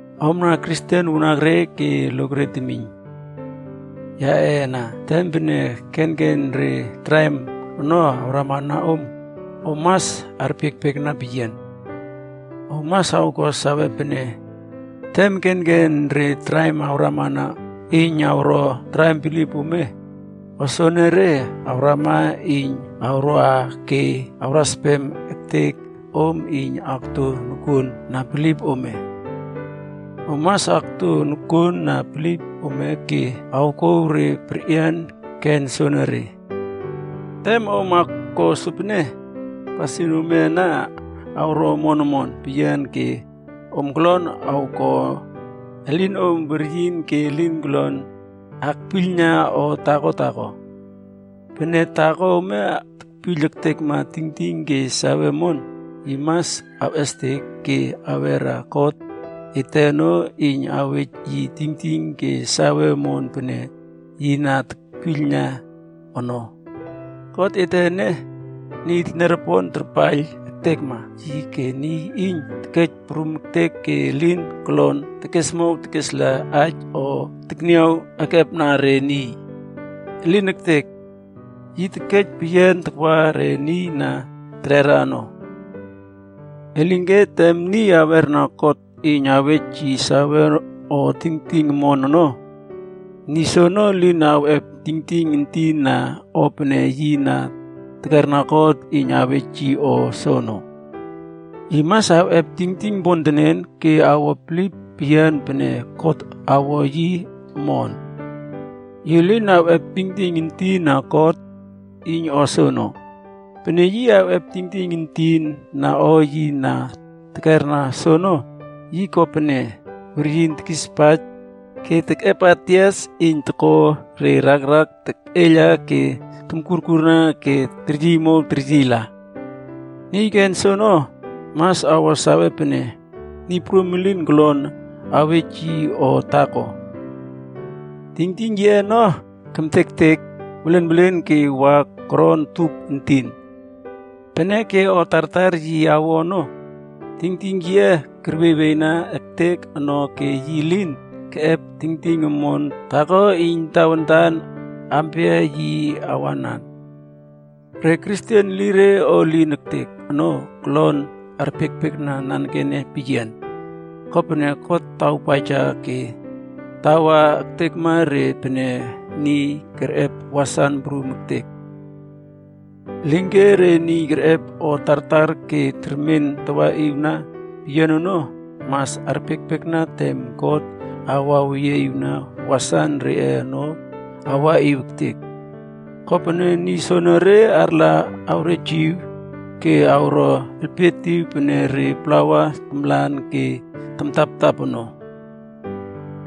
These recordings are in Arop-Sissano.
Omna Kristen wanakre ke lokre temiyna yaꞌe ana, tem pene kenken re traim ono awramana om, om mas arpiekpiekna peyian. Om mas awko sawe pene, tem kenken re traim awrama iyn awro traim bilip ome, o soenere awrama iyn awroa ke awraspem ektek om iyn akto nokuon na bilip ome. Om mas akto nokuon na bilip ome ke awkouw re perꞌian ken soenere. Tem om awko sopene, pasin ome ana awro omon omon peyian ke om kolon awkon elinom weryin ke elin kolon akpiylna o taako taako. Pene taako ome tekpiyl ektekna tingting ke sawe omon, yi mas awꞌestek ke awera God ete ono iyn awej yi tingting ke sawe omon pene yi na tekpiylna ono. God ete ene, niy teniaropon tarpaiyl ektekma yi ke niy iyn tekej prum ektek ke elin kolon tekesmow tekesla aij o tekniaw ekepna re niy. Elin ektek! Yi tekej peyian takwa re niy na terera ono. Elinke tem niy awerna God iyn awej yi sawe o tingting omon ono, niy soono elin awꞌep tingting entin na o pene yi na tekerna God iyn awej yi soono. Yi mas awꞌep tingting pontenen ke awo bilip peyian pene God awo yi omon. Yi lin awꞌep tingting entin na God iyn o soono. Pene yi awꞌep tingting entin na o yi na tekerna soono, yi ko pene weryin tekispaij ke tekꞌepa tias iyn toko re rakrak terꞌeiyla ke tomkurkurna ke teryiymow teryiyla. Niy ken soono, mas awo sawe pene Niy Prum elin kolon awej yi o taako. Tingting yiꞌe ono kemtektek welenwelen ke wa koron tup entin. Peneke o tartar yi awo ono, tingting yiꞌe kerwieywieyna ektek ono ke yi lin keꞌep tingting omon taako iyn tawantan aampia yi awanan. Re Kristen elire o elin ektek ono, kolon arpiekpiekna nanekene peyian, kopene God tawpaija ke tawa ektekma re pene niy kerꞌep wasan prum ektek. Elinke re niy kerꞌep o tartar ke termen tawaꞌiwna peyian ono, mas arpiekpiekna tem God awaweyieꞌiwna wasan reꞌe ono awaꞌiw ektek. Kopene niy soenere arla awrejiw ke awro elpietiw pene re plawa tamlan ke tamtaptap ono.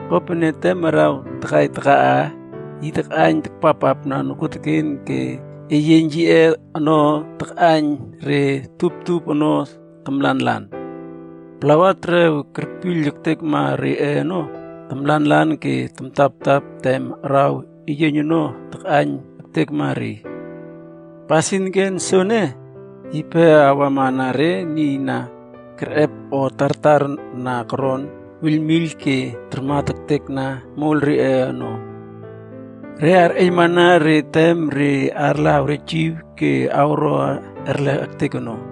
Kopene, tem araw takai takaꞌa, yi takꞌaiyn takpappapna nokuoteken ke eyieiyn yiꞌe ono takꞌaiyn re tuptup ono tamlanlan. Plawa terew kerpiyl ektekma reꞌe ono tamlanlan ke tamtaptap tem araw eyieiyn ono takꞌaiyn ektekma re. Pasin ken soene, yipe awamana re niy na kerꞌep o tartar na koron wiylwiyl ke tarmat ektekna moiyl reꞌe ono. Re arꞌeiylmana re tem re arla awrejiw ke awro erlek ektek ono.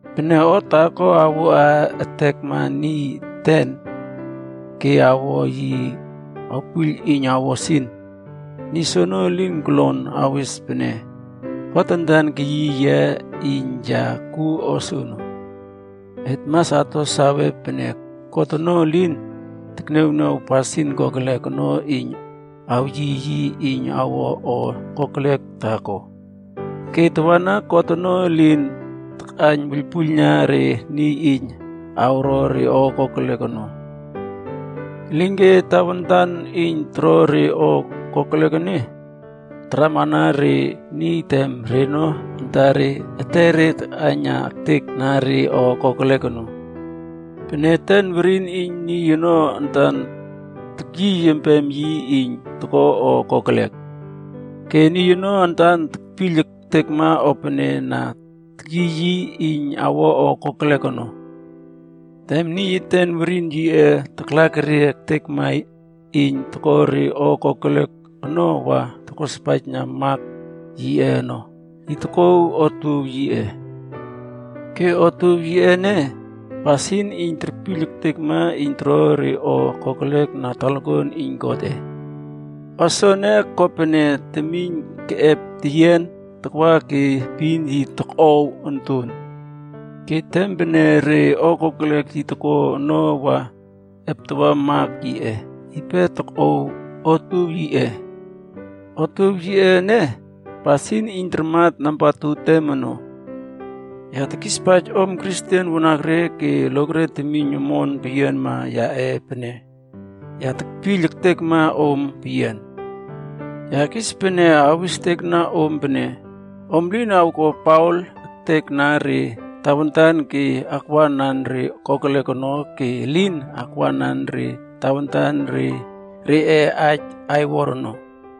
Pene o taako awoa ektekma niy eten ke awo yi awpiyl iyn awo sin, niy soono elin kolon awes pene, “God antan keyiy yia iyn ya kuo o soono.” Et mas ato sawe pene God ono elin tekniawniaw pasin kokelek ono iyn awyiy yi iyn awo o kokelek taako. Ke tawana God ono elin takꞌaiyn wuiylpuiylna re niy iyn awro re o kokelek ono. Elinke tawantan iyn toro re o kokelek ene, taramana re niy tem reno antare etere takaina ektek na re o kokelek ono. Peneke eten werin iyn niy ono antan tekyiy empem yi iyn toko o kokelek. Ke niy ono antan tekpiyl ektekma o pene na tekyiy yi iyn awo o kokelek ono. Tem niy eten werin yiꞌe taklakerie ektekma iyn toko re o kokelek ono wa tokospaijna mak yiꞌe ono, yi tokꞌow otuow yiꞌe. Ke otuow yiꞌe ene, pasin iyn terpiyl ektekma iyn toro re o kokelek na talakuan iyn Godꞌe. O soene, ko pene temiyn keꞌep teyian takwa ke epin yi tokꞌow onton. Ke tem pene re o kokelek yi toko ono wa eptawa mak yiꞌe, yipe tokꞌow otuow yiꞌe. Otuow yiꞌe ene, pasin iyn tarmat nambatu tem ono. Ya tekispaij om Kristen wanakre ke lokre temiyn omon peyianma yaꞌe pene, ya tekpiyl ektekma om peyian. Ya kis pene awistekna om pene, om lin awko paol ektekna re tawantan ke akwanan re kokelek ono ke elin akwanan re tawantan reꞌe aij aiwor ono.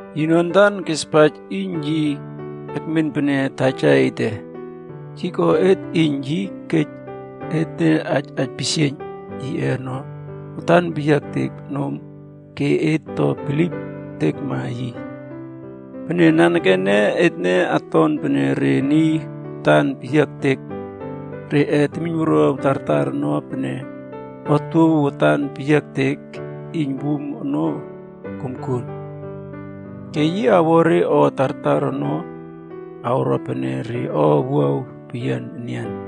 Yino antan kespaij iyn yi ekmen pene taja ete. Yi ko et iyn yi kej etne aij aipisieiyn yiꞌe ono watan peyiaektek nom ke et to bilip ektekna yi. Peneke nanekene etne oton pene re niy watan peyiaektek reꞌe temiynwuruaw tartar ono pene otuow watan peyiaektek iyn wum ono komkuon. Ke yi awo re o tartar ono awro pene re o owuaw peyian enian.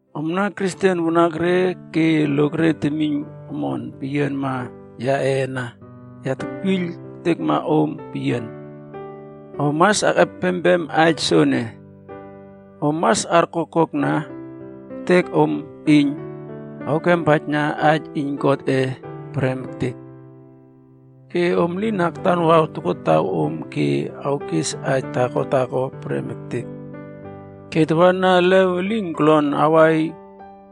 Omna Kristen wanakre ke lokre temiyn omon peyianma yaꞌe ana, ya tekpiyl ektekma om peyian. Om mas akꞌepempem aij soene: om mas arkokkokna ektek om iyn awkempaijna aij iyn Godꞌe prem ektek. Ke om lin aktanwaw tokotawom ke awkes aij taako taako prem ektek. Ke tawana elew elin kolon awai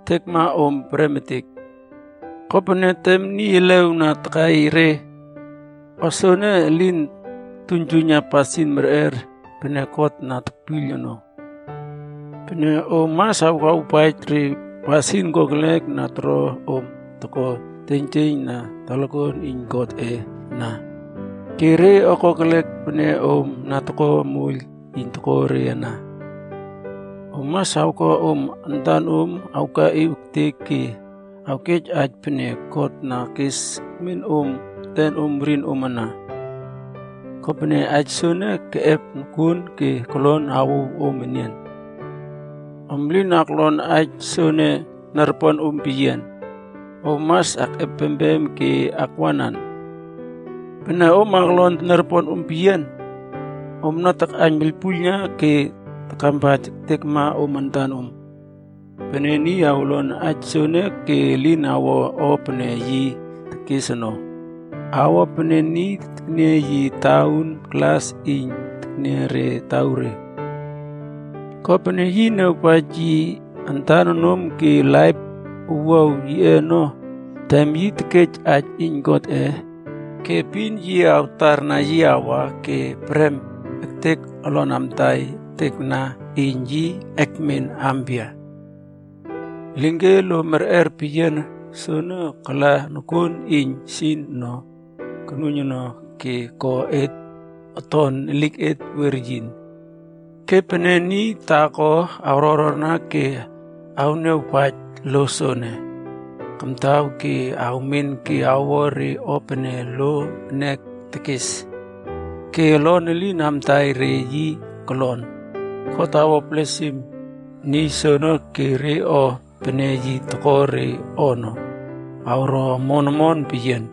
ektekma om prem ektek. Kopene, tem niy elew na takai re, o soene elin toktuiynjuiyna pasin merꞌer pene God na tekpiyl ono. Peneke om mas awkawpaij re pasin kokelek na toro om toko teiynjieiyn na talakuan iyn Godꞌe ana, ke re kokelek pene om na toko moiyl iyn toko re ana. Om mas awko om antanom awkaꞌiw ektek ke awkej aij pene God na kas ekmen om etenom werinom ana. Kopene aij soono keꞌep nokuon ke kolon awouw om enian. Om lin aklon aij soene teniaroponom peyian, om mas akꞌepempem ke akwanan. Pene om aklon teniaroponom peyian, omna takꞌaiyn wuiylpuiylna ke takampaij ektekma om antanom. Pene niy awlon aij soene ke elin awo o pene yi tekes ono, awo pene niy tekniaw yi tauun glas iyn terniaw re tauure. Kopene, yi niawpaij yi antan nom ke laip owuaw yiꞌe ono tem yi tekej aij iyn Godꞌe, ke epin yi awtarna yi awa ke prem ektek olon amtai ektekna iyn yi ekmen aampia. Elinke lo merꞌer peyian soene kala nokuon iyn sin ono konuiyn ono ke ko et oton eliket weryin. Ke pene niy taako awrororna ke awniawpaij lo soene kamtaw ke awmen ke awo re o pene lo ene tekes, ke olon elim amtaina re yi kolon, God awo blesim niy soono ke re o pene yi toko re ono, awro omon omon peyian.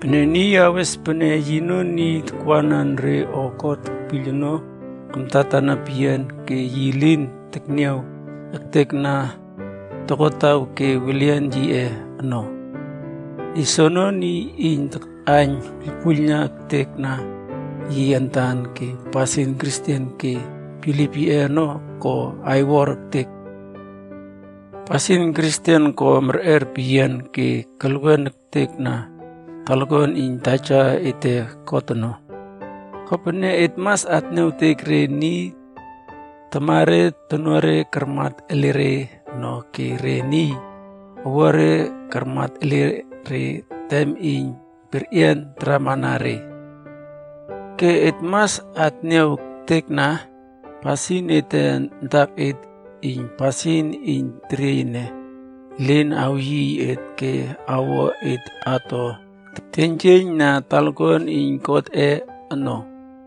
Pene niy awes pene yino niy takwanan re o God tekpiyl ono kamtatana peyian ke yi lin tekniaw ektekna tokotaw ke welian yiꞌe ono, niy soono niy iyn takꞌaiyn wuiylpuiyl ektekna yi antan ke pasin Kristen ke bilip yiꞌe ono ko aiwor ektek. Pasin Kristen ko merꞌer peyian ke kelwen ektekna talakuan iyn Taja ete God ono, kopene et mas atniawtek re niy tamare tonuare karmat ele re ono ke re niy owuare karmat ele re tem iyn perꞌian taramana re. Ke et mas atniaw ektekna pasin ete antaket iyn pasin iyn teriey ene elin awyiy et ke awo et ato teiynjieiyn na talakuan iyn Godꞌe ono.